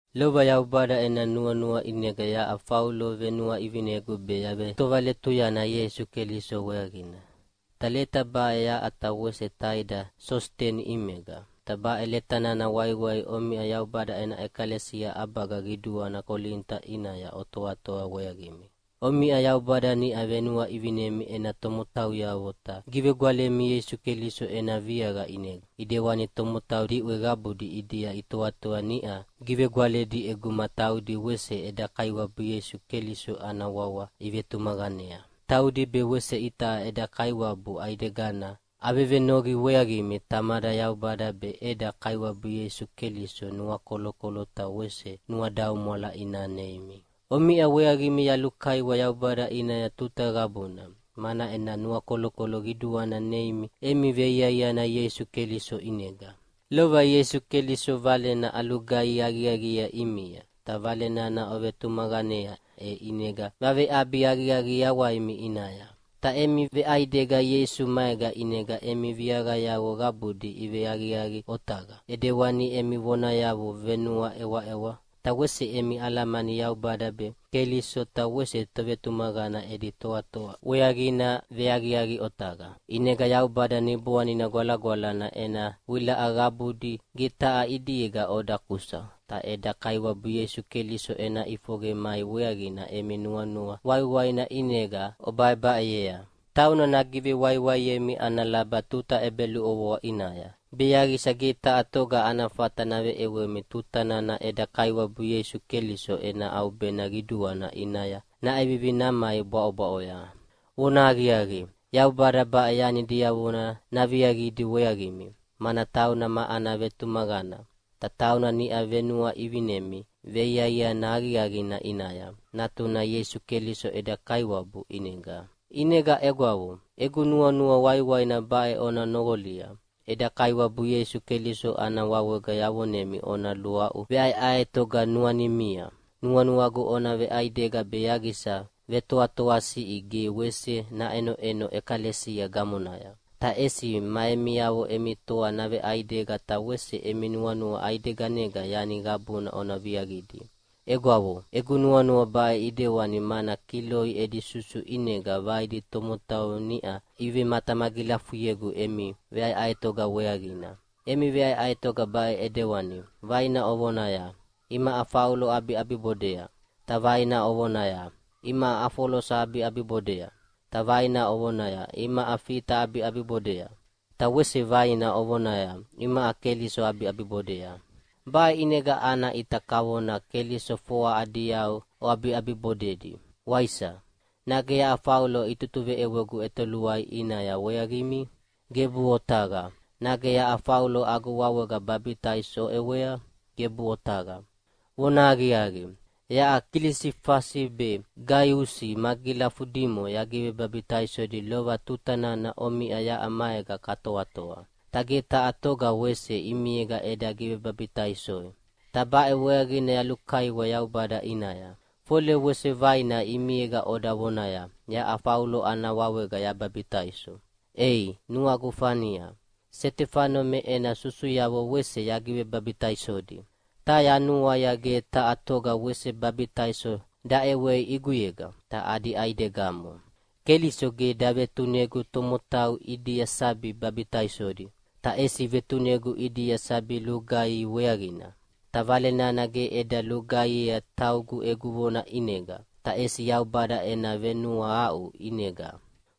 Lova Yaubada ena nuanua ʼinega yaʼa Faulo venuaʼivinegu be yavetovaletuyana Ieisu Keliso weaqina. Ta leta baʼe yaʼa ta wese taida Sositeni ʼimega. Ta baʼe leta nana waiwai omiʼa Yaubada ena ʼekalesia ʼabaga qiduana Kolinita ʼinaya otoatoa weaqimi. Omiʼa Yaubada niʼa venuaʼivinemi ena tomotauyavo ta givegwalemi Ieisu Keliso ena viaqa ʼinega, ʼidewani tomotau diʼwe qabudi ʼidia itoatoa niʼa givegwaledi ʼeguma taudi wese eda Kaiwabu Ieisu Keliso ana wawa ivetumaqanea. Taudi be wese itaʼa eda Kaiwabu ʼaidegana. Avevenoqi weaqimi Tamada Yaubada be eda Kaiwabu Ieisu Keliso nuakolokolo ta wese nuadaumwala ina neimi. Omiʼa weaqimi yalulukaiwa Yaubada ʼinaya tuta qabuna, mana ena nuakolokolo qiduana neimi emi veiaiana Ieisu Keliso ʼinega. Lova Ieisu Keliso Valena alugaihi aqiaqiea ʼimia, ta Vale nana ovetumaqanea e ʼinega vaveʼabi aqiaqi yawaimi ʼinaya. Ta emi veʼaidega Ieisu maega ʼinega emi viaqayavo qabudi iveaqiaqi otaqa, ʼidewani emi vonayavo venuaʼewaʼewa, ta wese emi alamani Yaubada be, Keliso ta wese tovetumaqana edi toatoa weaqina veaqiaqi otaqa. ʼInegana Yaubada Niboanina Gwalagwalana ena wilaʼa qabudi ge taha ʼidiega oda kusa, ta eda Kaiwabu Ieisu Keliso ena ʼifoqe mai weaqina emi nuanua waiwaina ʼinega obaʼebaʼeyea. Tauna nagivewaiwaiemi ana laba tuta ʼebeluʼovoa ʼinaya, be yaqisa ge taha toga ana fata naveʼewemi tuta nana eda Kaiwabu Ieisu Keliso ena ʼaubena qiduana ʼinaya naʼevivi namai bwaʼobwaʼoya. Vonahaqiaqi, Yaubada baʼe yani diavona naviaqidi weaqimi, mana tauna ma ana vetumaqana. Ta tauna niʼa venuaʼivinemi veiaiana aqiaqina ʼinaya, Natuna Ieisu Keliso eda Kaiwabu ʼinega. ʼInega egwavo, egu nuanua waiwaina baʼe ona noqolia! Eda Kaiwabu Ieisu Keliso ana wawega yavonemi ona luaʼu veʼaeʼaetoga nuanimia. Nuanuagu ona veʼaidega be yaqisa vetoatoasiʼi ge wese naʼenoʼeno ʼekalesia gamonaya. Ta ʼesi ma emiavo emi toa naveʼaidega ta wese emi nuanua ʼaideganega yani qabuna ona viaqidi. Egwavo, egu nuanua baʼe ʼidewani mana Kiloi edi susu ʼinega vaidi tomotau niʼa ivematamagilafuyegu emi veʼaeʼaetoga weaqina. Emi veʼaeʼaetoga baʼe ʼidewani, vaina ovonaya, “Imaʼa Faulo aʼabiʼabibodea!” ta vaina ovonaya, “Imaʼa Afolosa aʼabiʼabibodea!” ta vaina ovonaya, “Imaʼa Fita aʼabiʼabibodea!” ta wese vaina ovonaya, “Imaʼa Keliso aʼabiʼabibodea!” Baʼe ʼinega ana ʼita kavona Keliso foa adi yau oʼabiʼabibodedi, waisa? Nage yaʼa Faulo itutuveʼewegu ʼetoluai ʼinaya weaqimi? Gebuʼe otaqa! Nage yaʼa Faulo agu wawega babitaiso oʼewea? Gebuʼe otaqa! Vonahaqiaqi, yaʼa Kilisifasi be Gaiusi magilafudimo yagivebabitaisodi lova tuta nana omiʼa yaʼa maega katoatoa, ta ge taha toga wese ʼimiega eda givebabitaisoi. Ta baʼe weaqina yalulukaiwa Yaubada ʼinaya, fole wese vaina ʼimiega oda vonaya, “Yaʼa Faulo ana wawega yababitaiso.” (Ei, nuagu fania, Setefano me ena susuyavo wese yagivebabitaisodi, ta yanuaia ge taha toga wese baibitaiso daʼewei ʼiguyega, ta adi ʼaidegamo.) Keliso ge davetunegu tomotau ʼidia sabi babitaisodi, ta ʼesi vetunegu ʼidia sabi lugaihi weaqina. Ta Vale nana ge eda lugaihiea taugu egu vona ʼinega, ta ʼesi Yaubada ena venuahaʼu ʼinega,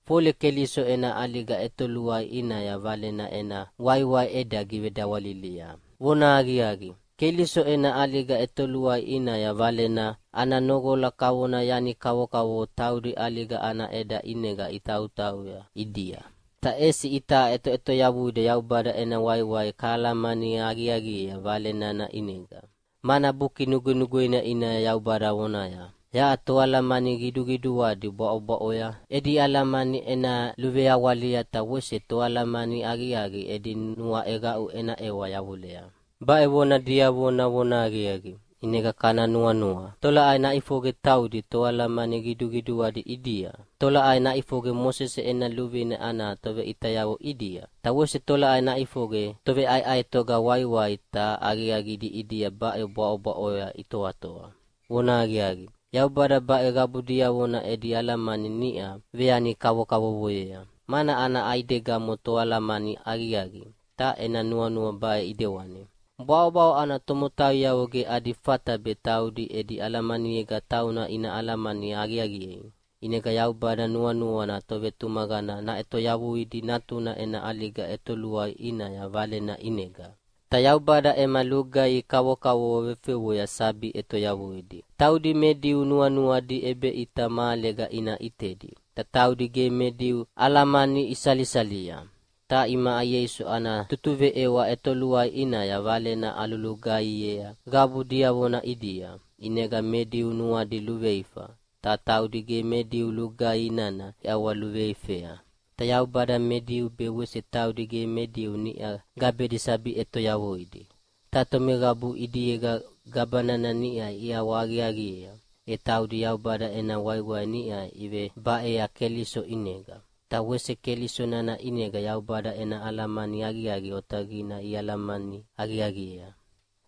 fole Keliso ena ʼaliga ʼetoluai ʼinaya Valena ena waiwai eda givedawalilia. Vonahaqiaqi, Keliso ena ʼaliga ʼetoluai ʼinaya Valena ana noqola kavona yani kavokavovo taudi ʼaliga ana ʼeda ʼinega itautauya ʼidia. Ta ʼesi itaʼa ʼetoʼetoyavuida Yaubada ena waiwai kahalamani aqiaqiea Vale nana ʼinega. Mana Buki Nugwenugweina ʼinaya Yaubada vonaya, “Yaʼa toalamani qiduqiduadi bwaʼobwaʼoya edi alamani ena luveawalia, ta wese toalamani aqiaqi edi nuaʼeqaʼu ena ʼewa yavulea.” Baʼe vona diavona vonahaqiaqi, ʼinega kana nuanua: Tolaʼai naʼifoqe taudi toalamani qiduqiduadi ʼidia? Ta tolaʼai naʼifoqe Mosese ena luvine ana toveʼitayavo ʼidia? Ta wese tolaʼai naʼifoqe toveʼaeʼaetoga waiwai ta aqiaqidi ʼidia baʼe bwaʼobwaʼoya itoatoa? Vonahaqiaqi, Yaubada baʼe qabu diavona edi alamani niʼa veyani kavokavovoyea, mana ana ʼaidegamo Toalamani aqiaqi, ta ena nuanua baʼe ʼidewani: Bwaʼobwaʼo ana tomotauyavo ge adi fata be taudi edi alamaniega tauna ina alamani aqiaqiei. ʼInegana Yaubada nuanuana tovetumaqana naʼetoyavuidi Natuna ena ʼaliga ʼetoluai ʼinaya Valena ʼinega. Ta Yaubada ema lugaihi kavokavovo vefewea sabi ʼetoyavuidi. Taudi me Diu nuanuadi ʼebeʼita mahalega ina ʼitedi, ta taudi ge me Diu alamani isalisalia. Ta imaʼa Ieisu ana tutuveʼewa ʼetoluai ʼinaya Valena alulugaihiea qabu diavona ʼidia, ʼinega me Diu nuadi luveifa, ta taudi ge me Diu lugaihi nana iʼawaluveifea. Ta Yaubada me Diu be wese taudi ge me Diu niʼa gabedi sabi ʼetoyavuidi. Ta tomeqabu ʼidiega gaba nana niʼa iʼawahaqiaqiea, e taudi Yaubada ena waiwai niʼa ivebaea Keliso ʼinega, ta wese Keliso nana ʼinega Yaubada ena alamani aqiaqi otaqina ialamani aqiaqiea.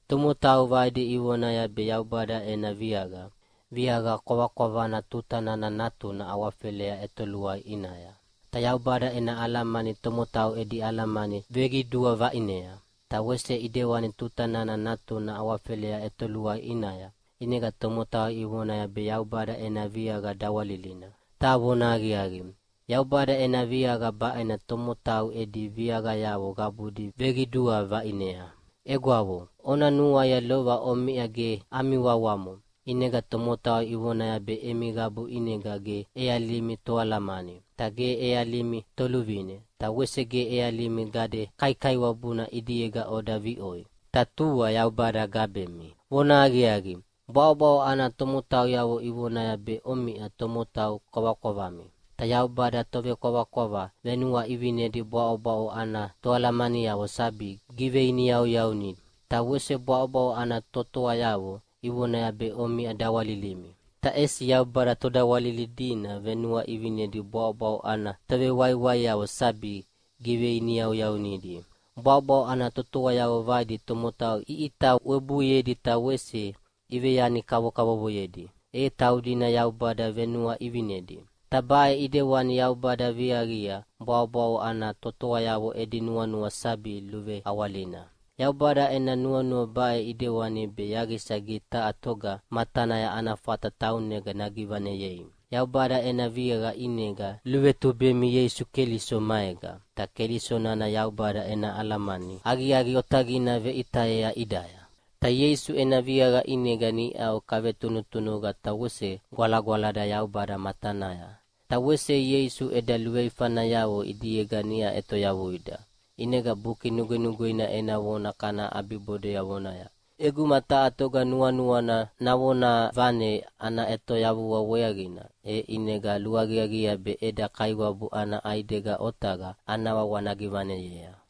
Tomotau vaidi ivonaya be Yaubada ena viaqa, viaqa kwavakwavana tuta nana Natuna awafelea ʼetoluai ʼinaya. Ta Yaubada ena alamani tomotau edi alamani veqidua vaʼinea. Ta wese ʼidewani tuta nana Natuna awafelea ʼetoluai ʼinaya, ʼinega tomotau ivonaya be Yaubada ena viaqa dawalilina. Ta vonahaqiaqi, Yaubada ena viaqa baʼena tomotau edi viaqayavo qabudi veqidua vaʼinea. Egwavo, ona nuaia lova omiʼa ge ami wawamo, ʼinega tomotau ivonaya be emi qabu ʼinega ge ʼealimi toalamani, ta ge ʼealimi toluvine, ta wese ge ʼealimi gade kaikaiwabuna ʼidiega oda viʼoi, ta tua Yaubada gabemi. Vonahaqiaqi, bwaʼobwaʼo ana tomotauyavo ivonaya be omiʼa tomotau kwavakwavami. Ta Yaubada tovekwavakwava venuaʼivinedi bwaʼobwaʼo ana toalamaniavo sabi giveiniyauyaunidi. Ta wese bwaʼobwaʼo ana totoayavo ivonaya be omiʼa dawalilimi. Ta ʼesi Yaubada todawalilidi venuaʼivinedi bwaʼobwaʼo ana tovewaiwaiavo sabi giveiniyauyaunidi. Bwaʼobwaʼo ana totoayavo vaidi tomotau iʼita webuiedi ta wese iveyani kavovoyedi, e taudina Yaubada venuaʼivinedi. Ta baʼe ʼidewani Yaubada viaqia bwaʼobwaʼo ana totoayavo edi nuanua sabi luveawalina. Yaubada ena nuanua baʼe ʼidewani be yaqisa ge taha toga matanaya ana fata taunega nagivaneyei. Yaubada ena viaqa ʼinega luvetubemi Ieisu Keliso maega. Ta Keliso nana Yaubada ena alamani aqiaqi otaqina veʼitayea ʼidaya. Ta Ieisu ena viaqa ʼinega niʼau kavetunutunuqa ta wese gwalagwalada Yaubada matanaya. Ta wese Ieisu eda luveifanayavo ʼidiega niʼa ʼetoyavuida. ʼInega Buki Nugwenugweina ena vona kana ʼabibodea vonaya, “ʼEguma taha toga nuanuana navonavane ana ʼetoyavua weaqina, e ʼinega luaqiaqiea be eda Kaiwabu ana ʼaidega otaqa ana wawa nagivaneyea.”